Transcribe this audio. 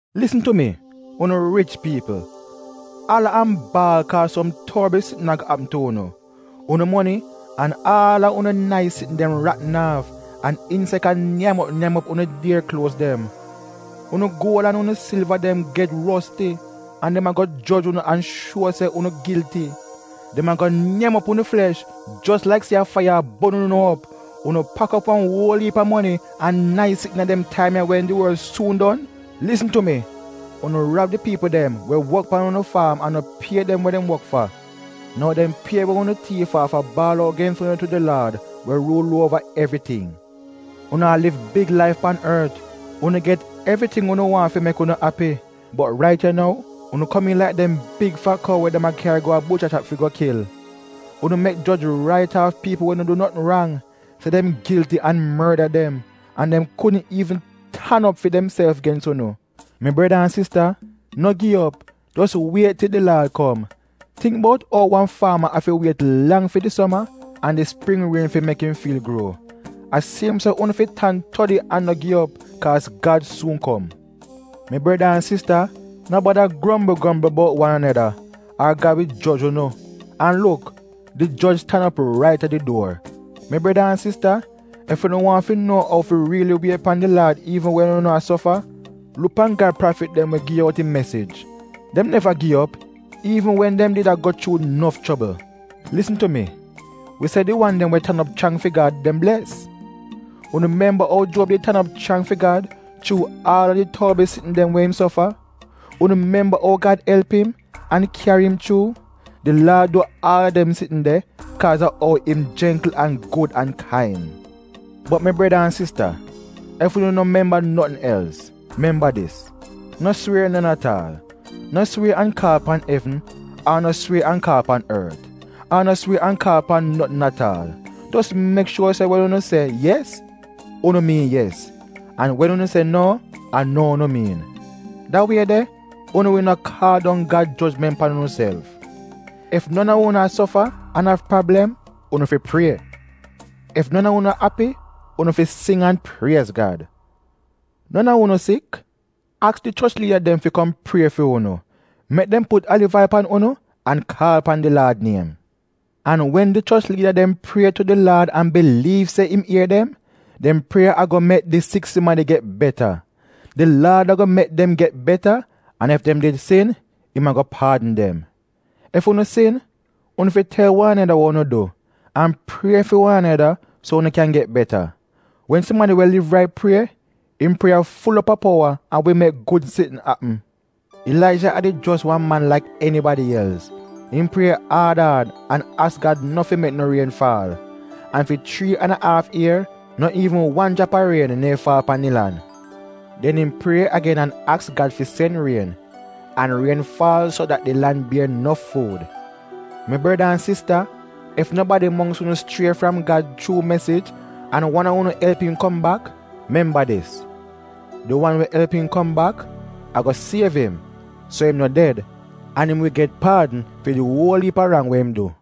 Lisn tu mi, unu rich piipl, ala an baal kaaz som torbl sitn ago apm tu unu! Unu moni an aal a unu nais sitn dem ratn aaf, an insek a nyam op nyam op unu dier kluoz dem. Unu guol an unu silva dem get rosti, an dem ago joj unu an shuo se unu gilti. Dem ago nyam op unu flesh jos laik se a faiya a bon unu op. Unu pak op wan uol iip a moni an nais sitn iina dem taim ya wen di worl suun don. Lisn tu mi! Unu rab di piipl dem we wok pan unu faam an no pie dem we dem wok fa. Nou dem pie we unu tiif aaf a baal out gens unu tu di Laad we ruul uova evriting. Unu a liv big laif pan ort. Unu get evriting unu waahn fi mek unu api. Bot rait ya nou, unu komiin laik dem big fat kou we dem a kyari go a bucha shap fi go kil. Unu mek joj rait aaf piipl we no du notn rang se dem gilti, an morda dem. An dem kudn iivn tan op fi demself gens unu. Mi breda an sista, no gi op, jos wiet til di Laad kom. Tingk bout ou wan faama afi wiet lang fi di soma an di spring rien fi mek im fiil gruo. A siem so unu fi tan todi an no gi op, kaaz Gad suun kom. Mi breda an sista, no bada grombl grombl bout wan aneda, ar Gad wi joj unu. An luk, di joj tan op rait a di duor. Mi breda an sista, ef unu waahn fi nuo ou fi riili wiet pan di Laad iivn wen unu a sofa, luk pan Gad prafit dem we gi out im mesij. Dem neva gi op, iivn wen dem did a go chuu nof chobl. Lisn tu mi, wi se di wan dem we tan op chrang fi Gad dem bles. Unu memba ou Juob did tan op chrang fi Gad chuu aal a di torbl sitn dem we im sofa? Unu memba ou Gad elp im, an kyari im chuu. Di Laad du aal a dem sitn de kaaz a ou im jengkl an gud an kain. Bot mi breda an sista, ef unu no memba notn els, memba dis, no swier non at aal. No swier an kaal pan evn, ar no swier an kaal pan ort, ar no swier an kaal pan notn at aal. Jos mek shuor se wen unu se “yes,” unu miin yes, an wen unu se “no,” a no unu miin. Da wie de unu wi no kaal dong Gad jojment pan unuself. Ef non a unu a sofa an av prablem, unu fi prie. Ef non a unu api, unu fi sing an priez Gad. Non a unu sik? Aks di choch liida dem fi kom prie fi unu. Mek dem put aliv ail pan unu an kaal pan di Laad niem. An wen di choch liida dem prie tu di Laad an biliiv se im ier dem, dem prieya ago mek di sik sumadi get beta. Di Laad ago mek dem get beta, an ef dem did sin, im ago paadn dem. Ef unu sin, unu fi tel wan aneda wa unu du, an prie fi wan aneda so unu kyan get beta. Wen sumadi we liv rait prie, im prieya ful op a powa an wi mek gud sitn apm. Ilaija a did jos wan man laik enibadi els. Im prie aad aad an aks Gad no fi mek no rien faal. An fi chrii an a aaf ier, no iivn wan jrap a rien neehn faal pan di lan. Den im prie agen an aks Gad fi sen rien, an rien faal so dat di lan bier nof fuud. Mi breda an sista, ef nobadi mongks unu schrie fram Gad chuu mesij an wan a unu elp im kom bak, memba dis: di wan we elp im kom bak ago siev im so im no ded an im wi get paadn fi di uol iip a rang we im du.